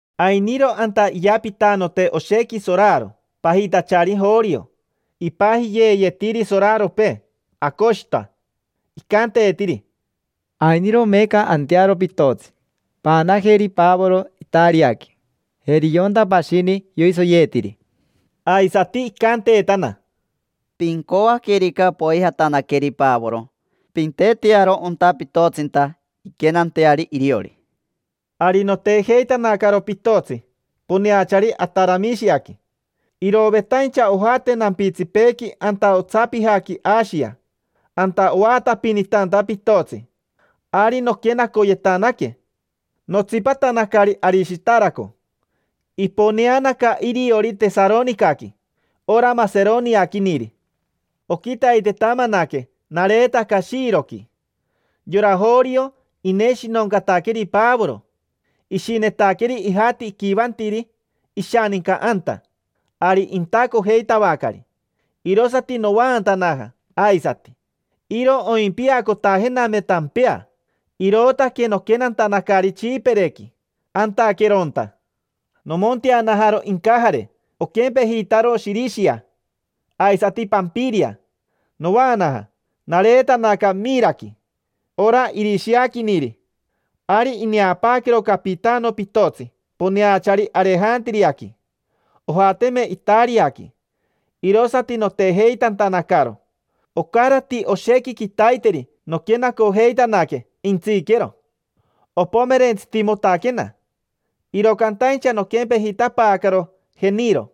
Ainiro anta iyapitanote oshequi soraro, pajitachari Jorio. Ipajiyeeyetiri soraropee Aocoshita. Icanteetiri: —Ainiro meeca antearo pitotsi, paanajeri Pavoro Itariaqui, jeri yonta pashini yoisoyeetiri. Aisati icanteetana: —Pincoaquerica poijatanaqueri Pavoro, pintetearo onta pitotsinta inquenanteari iriori. Ari notejeitanacaro pitotsi poneachari Ataramishiaqui, irovetaincha ojate nampitsipeequi anta otsapijaqui Ashia: anta oatapinitanta pitotsi. Ari noquenacoyetanaque, notsipatanacari Arishitaraco. Iponeanaca iriori Tesaronicaqui, ora maseroniaquiniri. Oquitaitetamanaque nareetaca Shiroqui. Yora Jorio, ineshinoncataqueri Pavoro: ishinetaqueri ijati iquivantiri ishaninca anta, ari intacojeitavacari. Irosati novaantanaja aisati. Iro oimpiacotajename tampea, irootaque noquenantanacari Tsipirequi, antaqueronta. Nomonteanajaro incajare oquempejitaro Shirishia, aisati Pampiria. Novaanaja, nareetanaca Miraqui, ora irishiaquiniri. Ari ineapaaquero capitano pitotsi poneachari Arejantiriaqui: ojateme Itariaqui, irosati notejeitantanacaro. Ocarati oshequi quitaiteri noquenacojeitanaque, jentsiquero. Opomerentsitimotaquena, iro cantaincha noquempejitapaacaro Jeniro.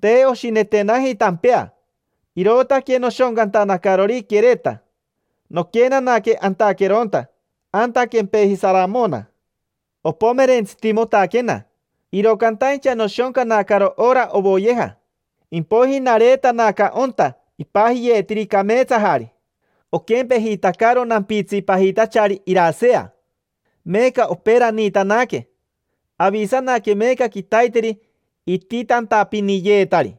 Te oshinetenaji tampea, irootaque noshoncantanacarori Quereta. Noquenanaque antaqueronta, anta quempeji Saramona. Opomerentsitimotaquena, iro cantaincha noshoncanacaro ora ovoyeja. Impoiji nareetanaca onta ipajiyeetiri: Cameetsajari. Oquempejitacaro nampitsi pajitachari Irasea. Meeca operaniitanaque, avisanaque meeca quitaiteri ititantapiniyeetari.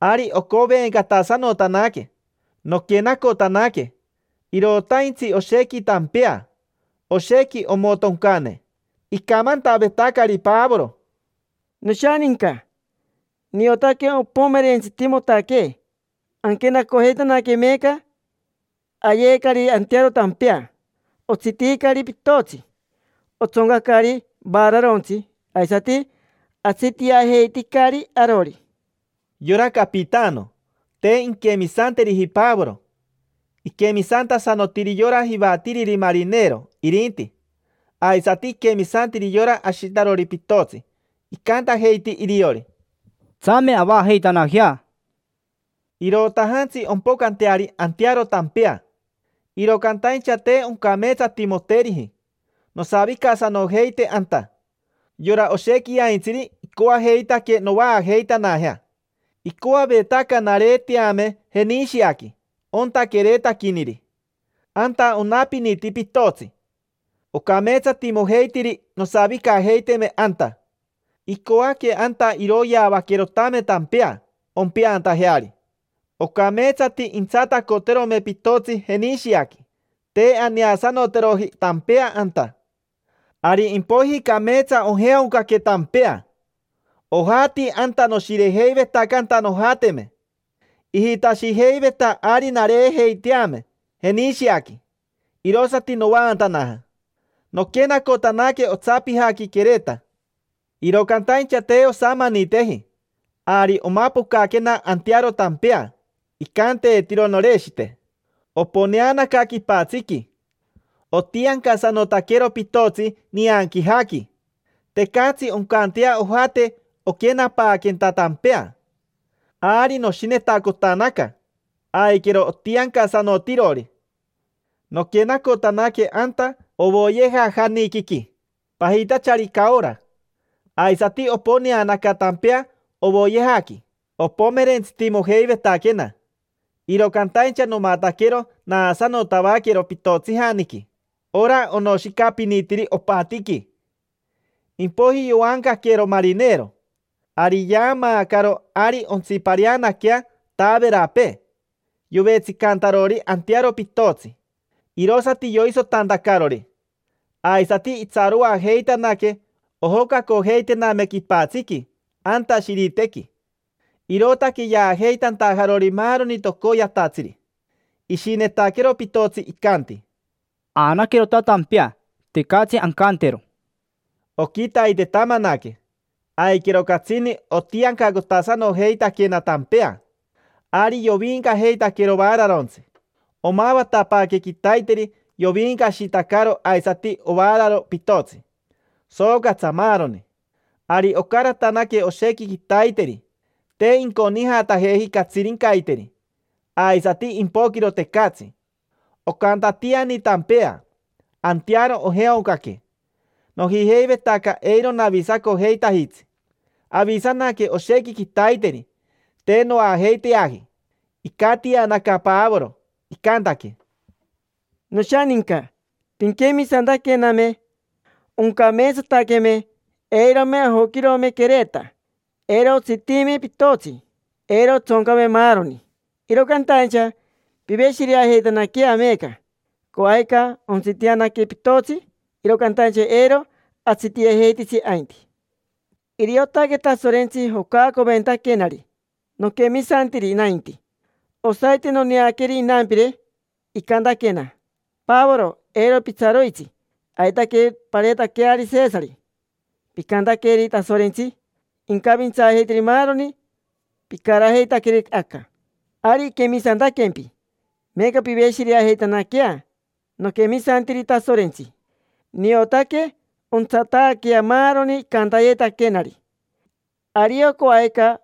Ari ocovencatasanotanaque noquenacotanaque: irotaintsi oshequi tampea, oshequi omotoncane. Icamantavetacari Pavoro: —Noshaninca, niotaque ompomerentsitimotaquee anquenacojeitanaque meeca. Ayeecari antearo tampea. Otsitiicari pitotsi, otsoncacari vaararontsi, aisati atsitiajeiticari arori. Yora capitano, te inquemisanteriji Pavoro; iquemisantasanotiri yora jivatiriri marinero, irinti. Aisati iquemisantiri yora ashitarori pitotsi. Icantajeiti iriori: —Tsame avaajeitanajea. Irotajantsi ompocanteari antearo tampea, iro cantaincha te oncameetsatimoteriji nosavicasanojeite anta. Yora oshequiaintsiri icoajeitaque novaajeitanajea. Icoavetaca nareeteame Jenishiaqui, onta queretaquiniri. Anta onapiniti pitotsi, ocameetsatimojeitiri nosavicajeiteme anta. Icoaque anta iroyeavaquerotame tampea, ompeantajeari. Ocameetsati intsatacoterome pitotsi Jenishiaqui: te aneasanoteroji tampea anta. Ari impoiji cameetsa ojeaoncaque tampea: ojati anta noshirejeivetacanta nojateme. Ijitashijeiveta ari nareejeiteame Jenishiaqui, irosati novaantanaja. Noquenacotanaque otsapijaqui Quereta. Iro cantaincha, te osamaniteji, ari omapocaquena antearo tampea, icanteetiro Noreshite. Oponeanaca quipatsiqui, otiancasanotaquero pitotsi nianquijaqui; tecatsi oncantea ojate oquenapaaquenta tampea. Ari noshinetacotanaca, aiquero otiancasanotirori. Noquenacotanaque anta ovoyejajaniquiqui pajitachari Caora. Aisati oponeanaca tampea ovoyejaqui. Opomerentsitimojeivetaquena, iro cantaincha nomataquero naasanotavaquero pitotsijaniqui: ora onoshicapinitiri opatiqui. Impoiji yoancaquero marinero. Ari yaamaacaro ari ontsipareanaquea taaverapee yovetsicantarori antearo pitotsi, irosati yoisotantacarori. Aisati itsaroajeitanaque ojocacojeitename quipatsiqui, anta Shiritequi, irootaque yaajeitantajarori maaroni tocoyatatsiri. Ishinetaquero pitotsi, icanti: —Aanaquerota tampea, tecatsi ancantero. Oquitaitetamanaque, aiquero catsini otiancacotasanojeitaquena tampea. Ari yoviincajeitaquero vaararontsi, pocn, pocn, pocn. Omavatapaaque quitaiteri yoviincashitacaro aisati ovaararo pitotsi, soocatsa, maaroni. Ari ocaratanaque oshequi quitaiteri: te inconijatajeji catsirincaiteri, aisati impoquiro, tecatsi. Ocantatiani tampea, antearo ojeaoncaque, sooo. Nojijeivetaca eiro navisacojeitajitsi. Avisanaque oshequi quitaiteri, te noajeiteaji. Icatianaca Pavoro, icantaque: —Noshaninca, pinquemisantaquename, oncameetsataqueme. Eirome ajoquirome Quereta, eiro otsitiime pitotsi, eiro otsoncame maaroni. Iro cantaincha piveshireajeitanaquea meeca. Coajica ontsitianaque pitotsi, iro cantaincha eiro atsitiajeititsi ainti. Iriotaque Tasorentsi jocaacoventaquenari. Noquemisantiri nainti. Osaite noneaqueri inampire, icantaquena: “Pavoro, eiro pitsaroitsi. Aitaque pareetaqueari Sesari. Picantaqueri Tasorentsi incavintsaajeiteri maaroni picarajeitaqueri aca: ari iquemisantaquempi”. Meeca, piveshireajeitanaquea. Noquemisantiri Tasorentsi, niotaque ontsataaquea maaroni icantayetaquenari. Ario coajica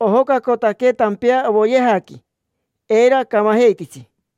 ojocacotaquee tampea ovoyejaqui, eiro acamajeititsi.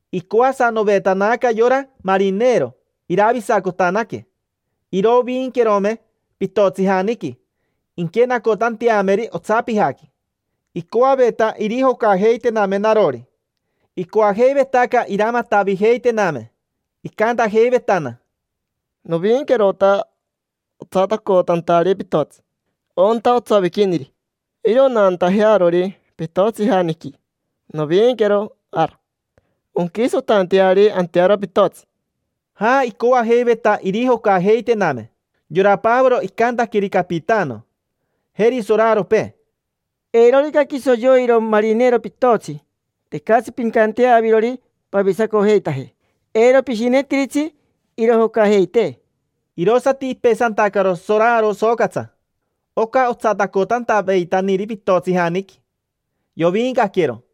Icoasanovetanaca yora marinero iravisacotanaque, iroviinquerome pitotsijaniqui inquenacotanteameri otsapijaqui. Icoaveta irijocajeitename narori. Icoajeivetaca iramatavijeitename, icantajeivetana: —Noviinquerota otsatacotantari pitotsi, onta otsoviquiniri. Iro naantajearori pitotsijaniqui, noviinquero ara, onquisotanteari antearo pitotsi. Ja, icoajeiveta irijocajeitename. Yora Pavoro icantaqueri capitano, jeri soraropee: —Eirorica quiso yoiro marinero pitotsi, tecatsi pincantea avirori pavisacojeitaje. Eiro pishinetiritsi irijocajeitee. Irosati ipesantacaro soraro socatsa: oca otsatacotantaveitaniri pitotsijaniqui. Yoviincaquero, pocn.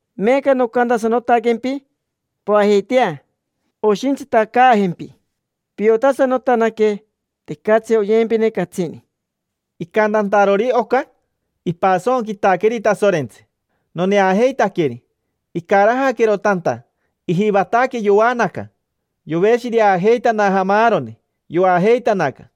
Meeca nocantasanotaquempi, poajeitea. Oshintsitacaajempi. Piotasanotanaque: tecatsi oyempine catsini. Icantantarori oca, ipasonquitaqueri Tasorentsi, noneajeitaqueri. Icarajaquero tanta, ijivataque yoanaca. Yoveshireajeitanaja maaroni, yoajeitanaca.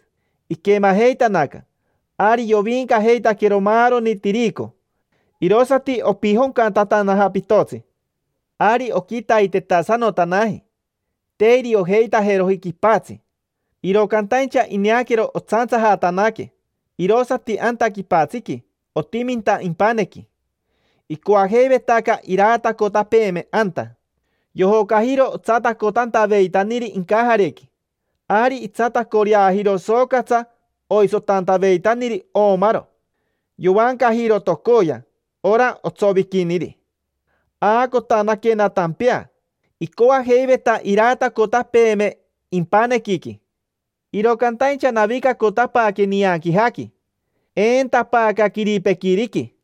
Iquemajeitanaca, ari yoviincajeitaquero maaroni tirico, irosati opijoncatantanaja pitotsi. Ari oquitaitetasanotanaji, te iriojeitajeroji quipatsi. Iro cantaincha ineaquero otsantsajatanaque irosati anta quipatsiqui, otiminta impanequi. Icoajeivetaca iraatacotapeeme anta. Yojocajiro otsatacotantaveitaniri incajarequi. Ari itsatacoreajiro soocatsa oisotantaveitaniri oomaro. Yovancajiro tocoya, ora otsoviquiniri. Aacotanaquena tampea, icoajeiveta iraatacotapeeme impanequiqui. Iro cantaincha navicacotapaaque nianquijaqui, eentapaaca quiripequiriqui.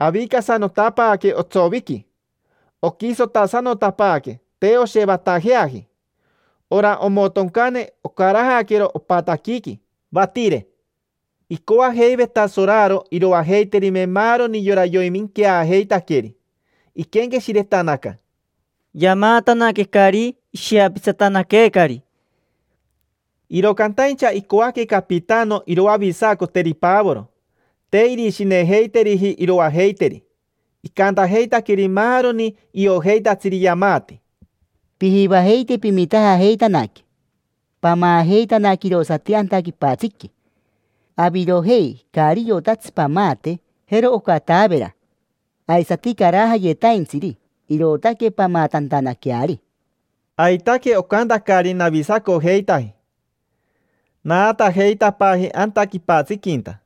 Avicasanotapaaque otsoviqui. Oquisotasanotapaaque, te oshevatajeaji. Ora omotoncane ocarajaquero opataquiqui, patire. Icoajeiveta soraro iroajeiterime maaroni yora yoiminqueajeitaqueri. Iquenqueshiretanaca: —Yamaatanaquecari, ishiapitsatanaqueecari. Iro cantaincha icoaque capitano iroavisacoteri Pavoro. Te irishinejeiteriji iroajeiteri. Icantajeitaqueri maaroni iojeitatsiri yamaati: —Pijivajeite pimitajajeitanaque, pamaajeitanaque irosati anta quipatsiqui. Avirojei caari iotatsi pamaate, jero oca taavera, aisati carajayetaintsiri: irootaque pamaatantanaqueari. Aitaque ocantacari, navisacojeitaji. Naatajeitapaaji anta quipatsiquinta.